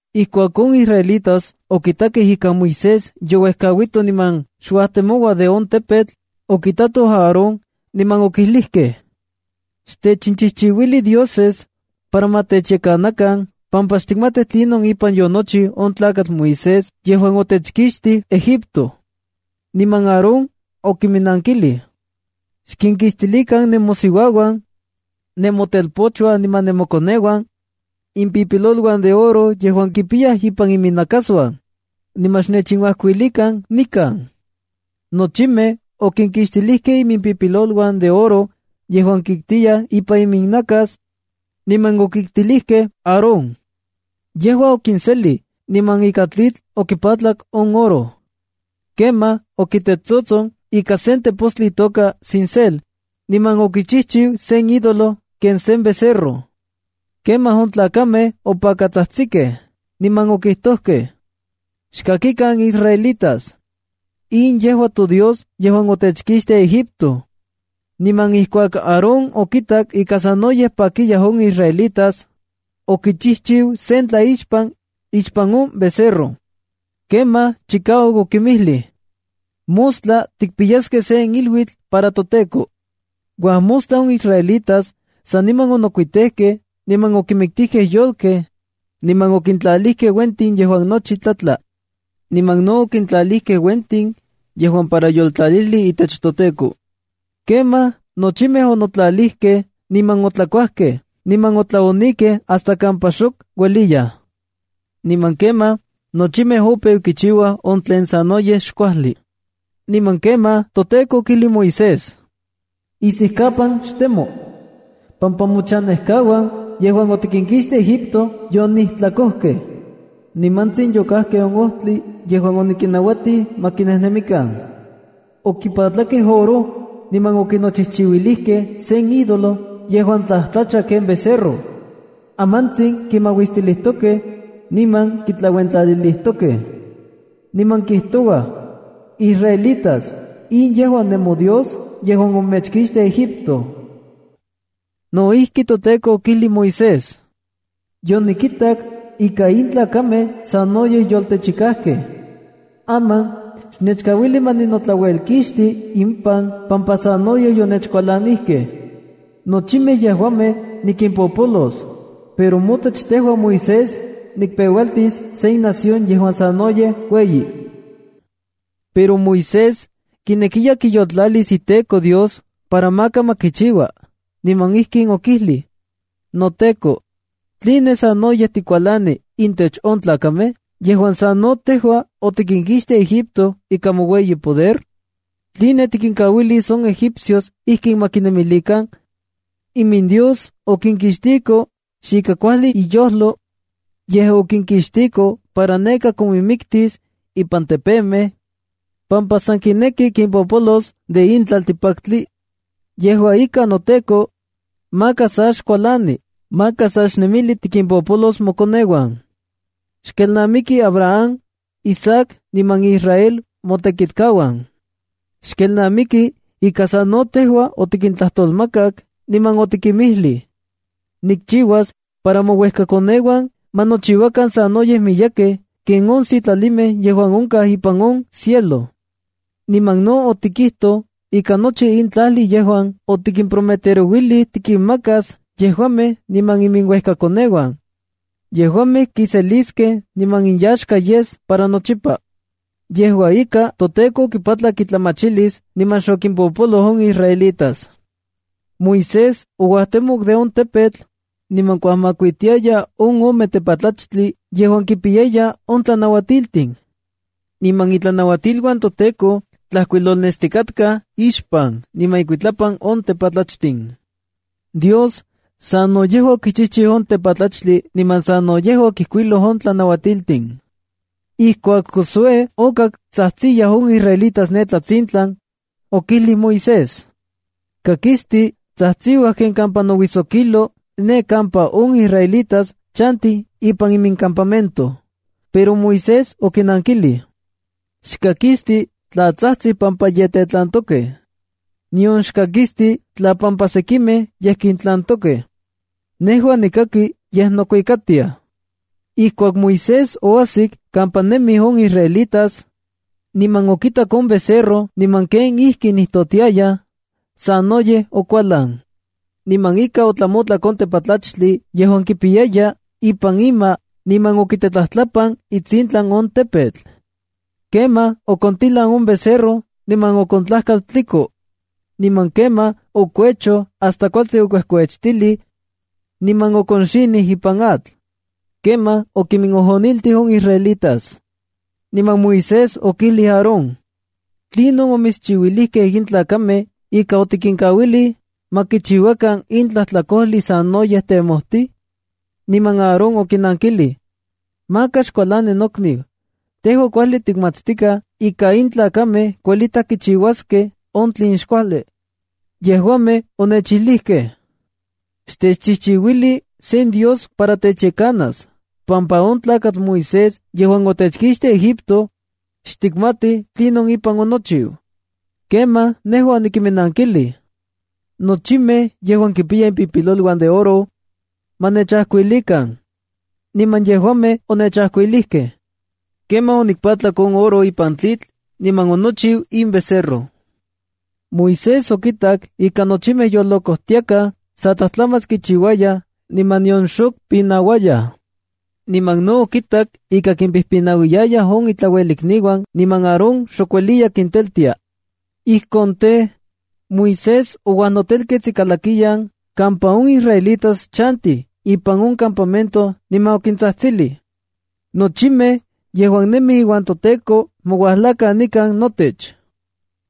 Ijkuak on israelitas okitakej ika Moisés youejkauito niman xuajtemoua de on tepetl, okitatoj Aarón, niman okijlijkej: —Xtechinchijchiuili dioses para ma techyekanakan pampa xtikmatij tlinon ipan yonochiu on tlakatl Moisés yejuan otechkixtij Egipto. Niman Aarón okiminnankilij: —Xkinkixtilikan nemosiuauan, nemotelpochuan niman nemochpochuan, impipiloluan de oro yejuan kipiyaj ipan iminnakasuan, niman xnechinuajkuilikan nikan. Nochimej okinokixtilijkej imimpipiloluan de oro yejuan kiktiyaj ipan iminnakas, niman okiktilijkej Aarón. Yejua okiselij, niman ika tlitl okipatlak on oro. Kemaj okitetsotson ika sen tepostli itoka cincel niman okichijchiu sen ídolo ken sen becerro. Kemaj on tlakamej opakatsajtsikej, niman okijtojkej: —¡Xkakikan israelitas, in yejua todios yejuan otechkixtij Egipto! Niman ijkuak Aarón okitak ika sanoyej pakiyaj on israelitas, okichijchiu sen tlaixpan ixpan on becerro. Kemaj chikauak okinmijlij: —¡Mostla tikpiyaskej sen iluitl para toTEKO! Uajmostla on israelitas saniman onokuitejkej niman okinmiktijkej yolkej niman okintlalijkej uentin yejuan nochi tlatla. Niman no okintlalijkej uentin yejuan para yoltlalijli itech toteko. Kemaj nochimej onotlalijkej niman otlakuajkej niman otlaonikej hasta kampa xok ueliyaj. Niman kemaj nochimej opeu kichiuaj on tlen sanoyej xkuajli. Niman kemaj toTEKO okijlij Moisés: —Isijkapan xtemo, pampa mochanejkauan yejuan otikinkixtij Egipto yonijtlakojkej. Nimantsin yokajkej on ojtli yejuan onikinnauatij ma kinejnemikan. Okipatlakej oro niman onochijchiuilijkej sen idolo yejuan tlajtlacha ken becerro. Amantsin kimauistilijtokej, niman kitlauentlalilijtokej. Niman kijtouaj: “Israelitas, in yejua nemodios yejuan omechkixtij Egipto.” No ijki, toTEKO okijlij Moisés: —Yonikitak ika in tlakamej sanoyej yoltechikajkej. Aman xnechkauili ma ninotlauelkixti impan pampa sanoyej yonechkualanijkej. Nochimej yejuamej nikimpopolos, pero motech tejua Moisés, nikpeualtis sen nación yejuan sanoyej ueyi. Pero Moisés kinekiya kiyoltlalis iTEKO Dios para maka ma kichiua, niman ijkin okijlij: —¡NoTEKO! ¿Tline sanoyej tikualani intech on tlakamej yejuan sa no tejua otikinkixtij Egipto ika moueyi poder? ¿Tline tikinkauilis on egipcios ijkin ma kinemilikan: “IminDios okinkixtiko xika kuajli iyojlo, yej okinkixtiko para neka kominmiktis ipan tepemej, pampa san kineki kimpopolos de in tlaltikpaktli?” Yejua ika, noTEKO, maka sa xkualani. Maka sa xnemilij tikimpopolos mokoneuan. Xkelnamiki Abraham, Isaac, niman Israel motekitkauan. Xkelnamiki ika sa no tejua otikintlajtolmakak, niman otikinmijlij: “Nikchiuas para mouejkakoneuan ma nochiuakan sanoyej miyekej ken on sitlalimej yejuan onkaj ipan on cielo.” Niman no otikijtoj ika nochi in tlajli yejuan otikimprometerouilij tikinmakas yejuamej niman iminuejkakoneuan, yejuamej kiseliskej niman inyaxka yes para nochipa. Yejua ika, toTEKO okipatlak itlamachilis niman xokimpopoloj on israelitas. Moisés ouajtemok de on tepetl, niman kuajmakuitiaya on ome tepatlachtli yejuan kipiyaya on tlanauatiltin. Niman itlanauatiluan toTEKO tlajkuilolnestikatkaj ixpan niman ikuitlapan on tepatlachtin. Dios sano yejua okichijchiu on tepatlachtli niman sano yejua okijkuiloj on tlanauatiltin. Ijkuak Josué okak tsajtsiyaj on israelitas ne tlatsintlan, okijlij Moisés: —Kakisti tsajtsiua ken kampa nouijsokilo ne kampa on israelitas chantij ipan imincampamento. Pero Moisés okinankilij: —Xkakisti tla tsajtsij pampa ye tetlantokej, nion xkakisti tla pampa sekimej ye kintlantokej. Nejua nikaki yej nokuikatiaj. Ijkuak Moisés oajsik kampa nemij on israelitas, niman okitak on becerro niman kenijkinijtotiayaj, sanoyej okualan. Niman inka, otlamotlak on tepatlachtli yejuan kipiyaya ipan ima niman okitetlajtlapan itsintlan on tepetl. Kemaj okontilan on becerro niman okontlajkal tliko. Niman kemaj okuechoj hasta kualtsin okuejkuechtilij, niman okonxinij ipan atl. Kemaj okiminojoniltij on israelitas. Niman Moisés okijlij Aarón: —¿Tlinon omitschiuilijkej in tlakamej ika otikinkauilij ma kichiuakan in tlajtlakojli sanoyej temojtij? Niman Aarón okinankilij: —¡Maka xkualani nokniu! Tejua kuajli tikmatstikaj ika in tlakamej kuelitaj kichiuaskej on tlen xkuajli. Yejuamej onechilijkej: “Xtechchijchiuili sen dios para techyekanas pampa on tlakatl Moisés yejuan otechkixtij Egipto, xtikmatij tlinon ipan onochiu.” Kemaj nejua onikinnankilij: “Nochimej yejuan kipiyaj impipiloluan de oro, ma nechajkuilikan. Niman yejuamej onechajkuilijkej. Kemaj onikpatlak on oro ipan tlitl niman onochiu in becerro. Moisés okitak ika nochimej yolocojtiakaj sa tlajtlamach kichiuayaj niman nion xok pinauayaj. Niman no okitak ika kimpijpinauiyayaj on intlauelikniuan niman Aarón xok ueliya kinteltia. Ijkon tej, Moisés ouajnotelkets ikalakiyan kampa on israelitas chantij ipan on campamento niman okintsajtsilij: —Nochimej yejuan nemij iuan toTEKO ma uajlakan nikan notech.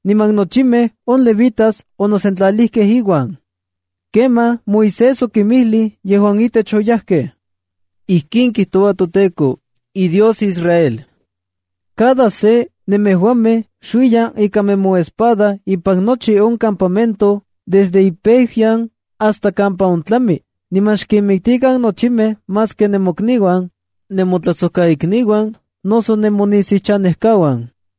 Niman nochimej on Levitas onosentlalijkej iuan. Kemaj Moisés okinmijlij yejuan itech oyajkej: —Ijkin kijtoua toTEKO, iDios Israel: ‘Cada se nemejuamej xuiyan ika nemoespada ipan nochi on campamento desde impeuyan hasta kampa ontlami, niman xkinmiktikan nochijmej maski nemokniuan, nemotlajsojkaikniuan noso nemonisiuchanejkauan’.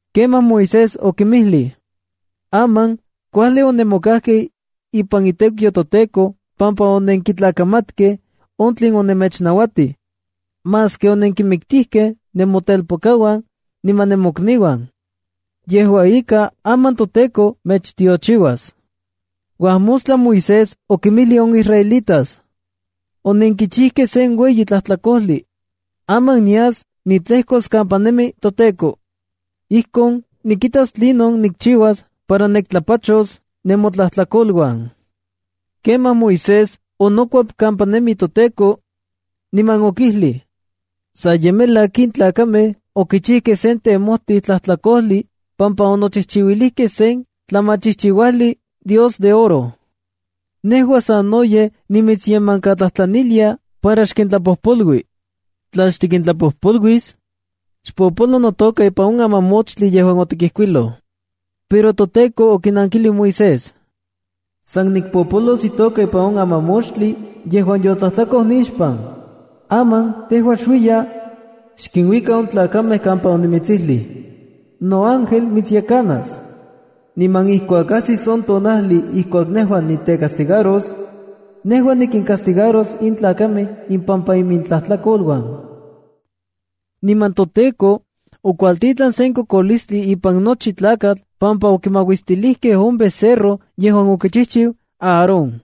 Kemaj Moisés okinmijlij: —Aman kuajli onemokajkej ipan itekiu toTEKO pampa onenkitlakamatkej on tlen omechnauatij, maski onenkinmiktijkej nemotelpokauan niman nemokniuan. Yejua ika, aman toTEKO mechtiochiuas. Uajmostla Moisés okinmijlij on israelitas: —Onenkichijkej sen ueyi tlajtlakojli. Aman nias nitlejkos kampa nemi toTEKO. Ijkon nikitas tlinon nikchiuas para niktlapachos nemotlajtlakoluan. Kemaj Moisés onokuep kampa nemi toTEKO, niman okijlij: —Sa ye melak in tlakamej okichijkej sen temojtij tlajtlakojli pampa onochijchiuilijkej sen tlamachijchiuajli dios de oro. Nejua sanoyej nimitsyemankatlajtlanilia para xkintlapojpolui. Tla xtikintlapojpoluis, xpopolo notoka ipan on amamoxtli yejuan otikijkuiloj. Pero toTEKO okinankilij Moisés: —San nikpopolos itoka ipan on amamoxtli yejuan yotlajtlakoj nixpan. Aman tejua xuiya, xkinuika on tlakamej kampa onimitsijlij. Noángel mitsyekanas. Niman ijkuak ajsis on tonajli ijkuak nejua nitecastigaros, nejua nikincastigaros in tlakamej ipampa imintlajtlakoluan. Niman toTEKO okuajtitlan sen kokolistli ipan nochi tlakatl pampa okimauistilijkej on becerro yejuan okichijchiu Aarón.